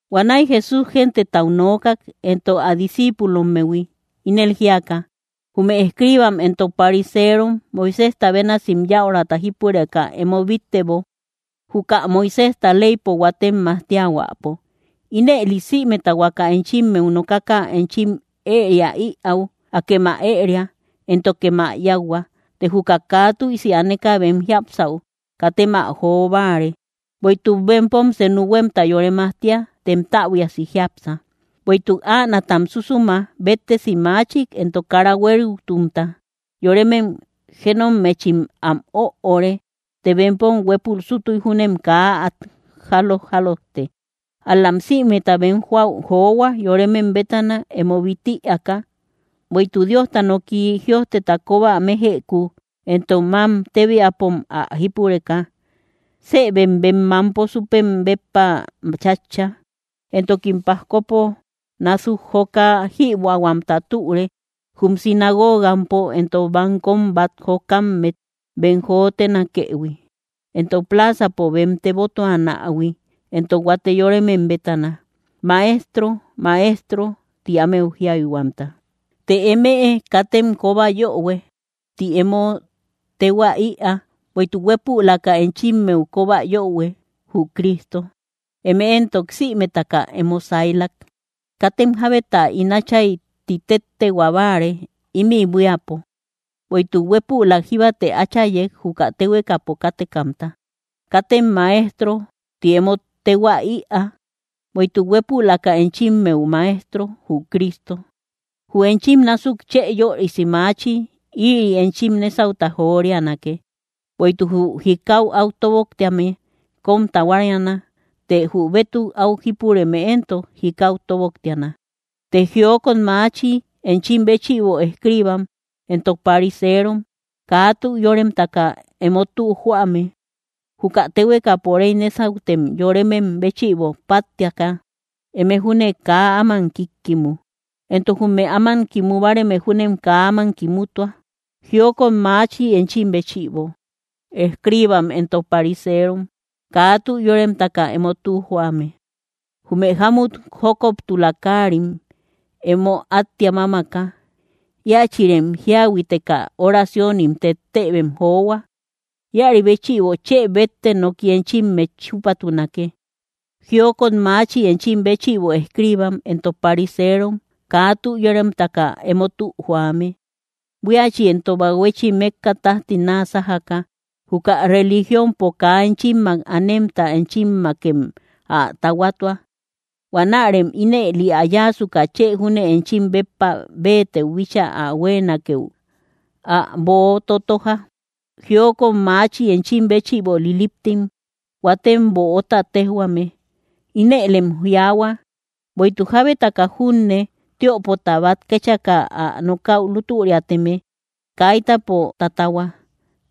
Huanäi Jesús gentetau nookak, entok ä discíipulommehui, ínel jíaka: —Jume escriibam entok pariserom, Moiséjta bénasim yäurata jípureka emo bíttebo, juka Moiséjta leypo huatem majtiahuäpo. Ínëli sïmeta huaka enchimmeu nokaka enchim ëria ïau, akem ä ëria, éntokem ä yáuhua. Të juka kaa tüisi aneka bem jiapsäu, katem ä joo báare; bueïtuk bempom senu huémta yore majtia, tem täbuiasi jiápsa. Bueïtuk änaatam súsuma béttesi maachik entok kara huériutumta, yoremem jénommetchim am öore; të bempom huépul sútuy júnem kaa át jálo‑jálojte. Ál‑lam sïmeta bem joäu johua, yoremem bétana emo bít ïaaka; bueïtuk Diosta nooki jïojteta kóba mejëku entok mám tébiapom ä jípureka, sëbem bem mánto súpem béppa chátcha. Entokim pajkopo násuk joka jïbuähuamta türe, jum sinagogampo entok bankom bát jokammet bem jotenakëhui, entok pláazapo bem tebotuanähui, entok huate yoremem bétana, “¡Maestro, Maestro!”, ti ámeu jiayhuamta. ’Të emëe, katem “kóba yöhue” ti emo téhua ïaa; bueïtuk huépülaka enchimmeu kóba yöhue, jü Cristo; eme éntok sïmetaka emo saylak. Katem jábeta “ín Átchay” ti téttehua báare ímï buíapo; bueïtuk huépülak jíbate Áchayek, juka téhuekapo kátekamta. Katem “Maestro” ti emo téhua ïaa; bueïtuk huépülaka enchimmeu Maestro, jü Cristo. Jü enchim násuk chë yörisi maachi, ïri enchim nésauta jorianake. Bueïtuk jü jikau áu tóboktéame, kóm tahuariana; të jü bétuk áu jípureme éntok, jikau tóboktiana. ’Të, ¡jiokot maachi enchim béchïbo, escriibam entok pariserom, kaa tü yóremtaka emo tü joame! Juka téhuekapo réy nésautem yoremem béchïbo páttiaka, eme júne kaa áman kíkkimu, entok jume áman kimu báareme júnem kaa áman kimutua. ’¡Jiokot maachi enchim béchïbo, escriibam entok pariserom, kaa tü yóremtaka emo tü joame! Jume jámut jókoptula káarim emo áttia mámaka, íachïrem jíahuiteka oraciónim tettëbem johua. Íäri béchïbo chë bétte noki enchimmet chúpatunake. ’¡Jiokot maachi enchim béchïbo, escriibam entok pariserom, kaa tü yóremtaka emo tü joame! Buíachi entok bahuechi mékka tájti náa sájaka, juka religiompo kaa enchimmak anemta enchimmakem ä tahuatua. Huanärem ínëli ä yáasuka, chë júne enchim béppa béetëu bíchaa ä huéenakeu, ä boo totoja. ’¡Jiokot maachi enchim béchïbo, liliptim huatem böota téjhuame! Inëlem jiaahua: “Bueïtuk jábetaka junne tiöpota bát kéchaka ä nokäu lútüriateme, kaitapo tatahua;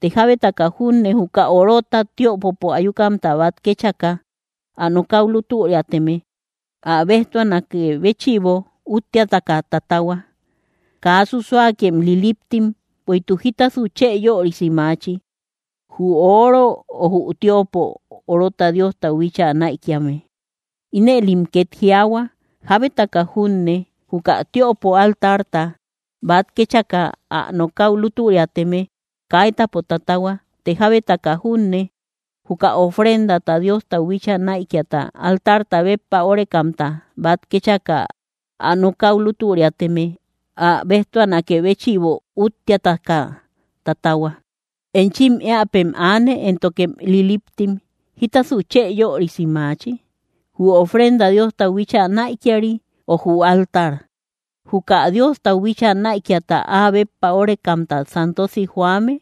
të jábetaka junne juka orota tiöpopo ayukamta bát kéchaka ä nokäu lútüriateme, ä béjtuanakë béchïbo úttiataka tatahua.” ¡Kaa susuakem liliptim! Bueïtuk, ¿jítasasu chë yörisi maachi? ¿Jü oro o jü tiöpo orota Diostau bíchaa näikiame? Inëlem két jiaahua: “Jábetaka junne juka tiöpo altarta bát kéchaka ä nokäu lútüriateme, kaitapo tatahua; të jábetaka junne juka ofrendata Diostau bíchaa näikiata altarta béppa órekamta bát kéchaka ä nokäu lútüriateme, ä béjtuanakë béchïbo úttiataka tatahua.” ¡Enchim éäpem aane, éntokem liliptim! ¿Jítasu chë yörisi maachi? ¿Jü ofrenda Diostau bíchaa näikiari, ö jü altar, juka Diostau bíchaa näikiata áa béppa órekamta santosi joame?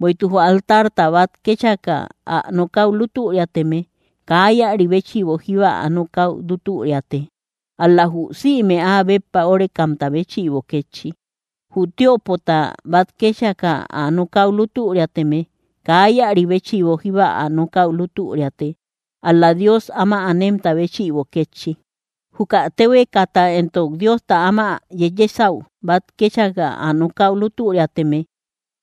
Bueïtuk jü altarta bát kéchaka ä nokäu lútüriateme, kaa íäri béchïbo jíba ä nokäu lútüriate, ál‑la jü sïme áa béppa órekamta béchïbo kétchi. Jü tiöpota bát kéchaka ä nokäu lútüriateme, kaa íäri béchïbo jíba ä nokäu lútüriate, ál‑la Dios áma anemta béchïbo kétchi. Juka téhuekata entok Diosta áma yeyesäu bát kéchaka ä nokäu lútüriateme,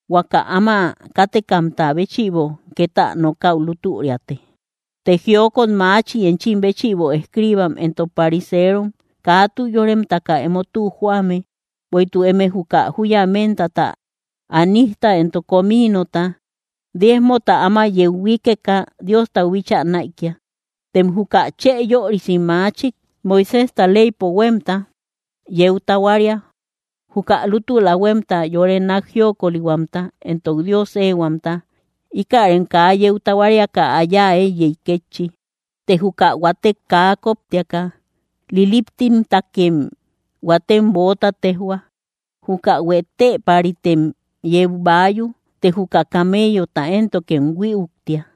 huaka áma kátekamta béchïbo két ä nokäu lútüriate. ’Të, ¡jiokot maachi enchim béchïbo, escriibam entok pariserom, kaa tü yóremtaka emo tü joame! Bueïtuk eme juka júya méntata, anísta, entok cominota, diezmota áma yeu huíkeka Diostau bíchaa näikia; tem juka chë yörisi machik Moiséjta leypo huémta yeu tahuaria. Juka lútula huémta, yore nák jiokolihuamta, entok Dios éehuamta, íkärem kaa yeu tahuariaka ä yáa éiyey kétchi, të juka huatek kaa kóptiaka. ¡Liliptimtakem huatem böota téjhua! ¡Juka huetëpäritem yeu baayu, të juka kameyota éntokem huïuktia!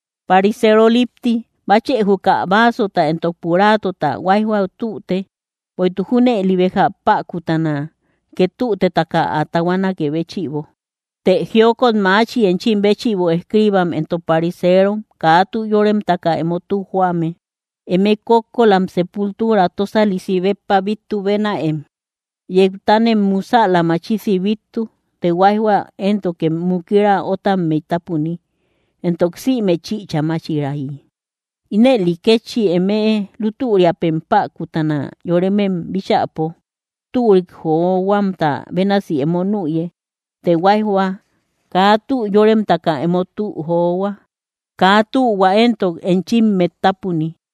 ¡Parisero lipti! Báchë juka báasota entok puraátota huáijhua tüte; bueïtuk junëli béja päkutana két tütetaka ä tahuanakë béchïbo. ’Të, ¡jiokot maachi enchim béchïbo, escriibam entok pariserom, kaa tü yóremtaka emo tü joame! Eme kókkolam sepultura tósalisi béppa bíttu bénäem; yeutanem musäla machisi bíttu, të huáijhua éntokem mukira ótammey tápuni, entok sïme chïcha máchirayi. Ínëli kétchi emëe, lútüriapem päkutana yoremem bíchäpo, türik johuamta bénasi emo nüye; të huáijhua kaa tü yórememtakem emo tü johua; kaa tühua éntok enchimmet tápuni.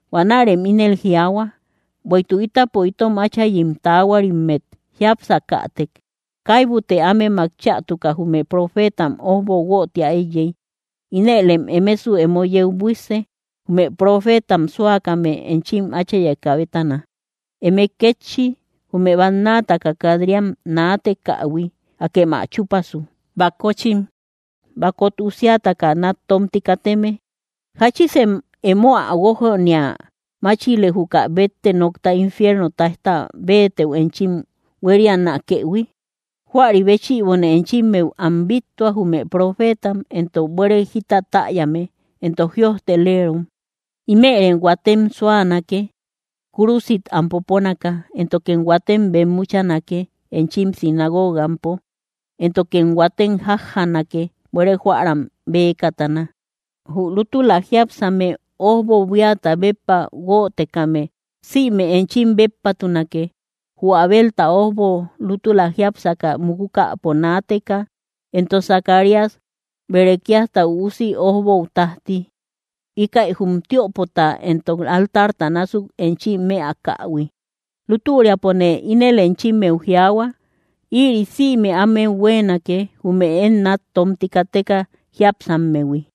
Huanärem ínel jiaahua: “Bueïtuk ítapo itom áchayim taahuarimmet jiápsakätek, kaibute ámemak chätuka jume profeetam ójbo guötia éiyey.” Inëlem emesu emo yeu buísse, jume profeetam súakame enchim áchayekä bétana. Eme kétchi, jume bannataka kat‑riam naatekähui, ¡akem ä chúpasu! ’¡Bakochim! ¡Bakot usiataka nát tómti kateme! ¿Jáchisem emo ä guójania máchile, juka bétte nokta infierno táijta béetëu enchim huérianakëhui? Huäri béchïbone enchimmeu am bíttua, jume profeetam, entok buére jita täyame, entok jïojtelerom. Ímërem huatem súanake, kúrusit am poponaka; éntokem huatem bemmuchanake, enchim singoogampo; éntokem huatem jájjanake buére jóäram bëkatana. Jü lútula jiápsame ójbo, buíata béppa guötekame sïme enchim béppatunake, jü Abelta ójbo lútula jiápsaka mukukäpo naateka, entok Zacarías, Berequíasta üusi ójbou tájti, íkäi jum tiöpota entok altarta násuk enchim mëakähui. Lútüriapone ínel enchimmeu jiaahua: Ïri sïme ámeu huéenake, jume én nát tómti kateka jiápsammehui.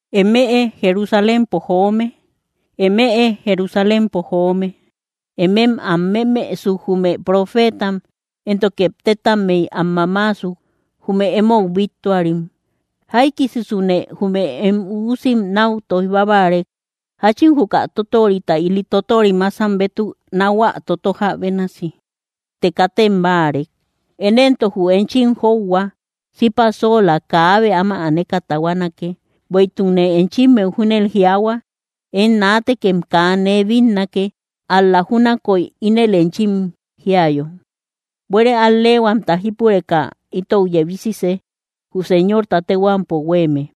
’¡Emëe Jerusalénpo joome, emëe Jerusalénpo joome! ¡Émem am memësuk, jume profeetam, éntoke tétammey am mamaasuk, jume emou bíttuarim! ¡Jaikisisune jume em üusim náu tóij bábarek, jáchin juka tótorita ili tótorim másam bétuk náhuä totoja bénasi! ¡Të katem báarek! Én éntok jü enchim jóuhua sipa sóola kaabe áma aneka tahuanake. Bueïtukne enchimmeu júnel jiaahua: Én naatekem kaa nee bínnake, ál‑la júnakoy ínel enchim jíayo: “¡Buére al‑leehuamta jípureka itou yebisise, jü Señorta téhuampo huéeme!”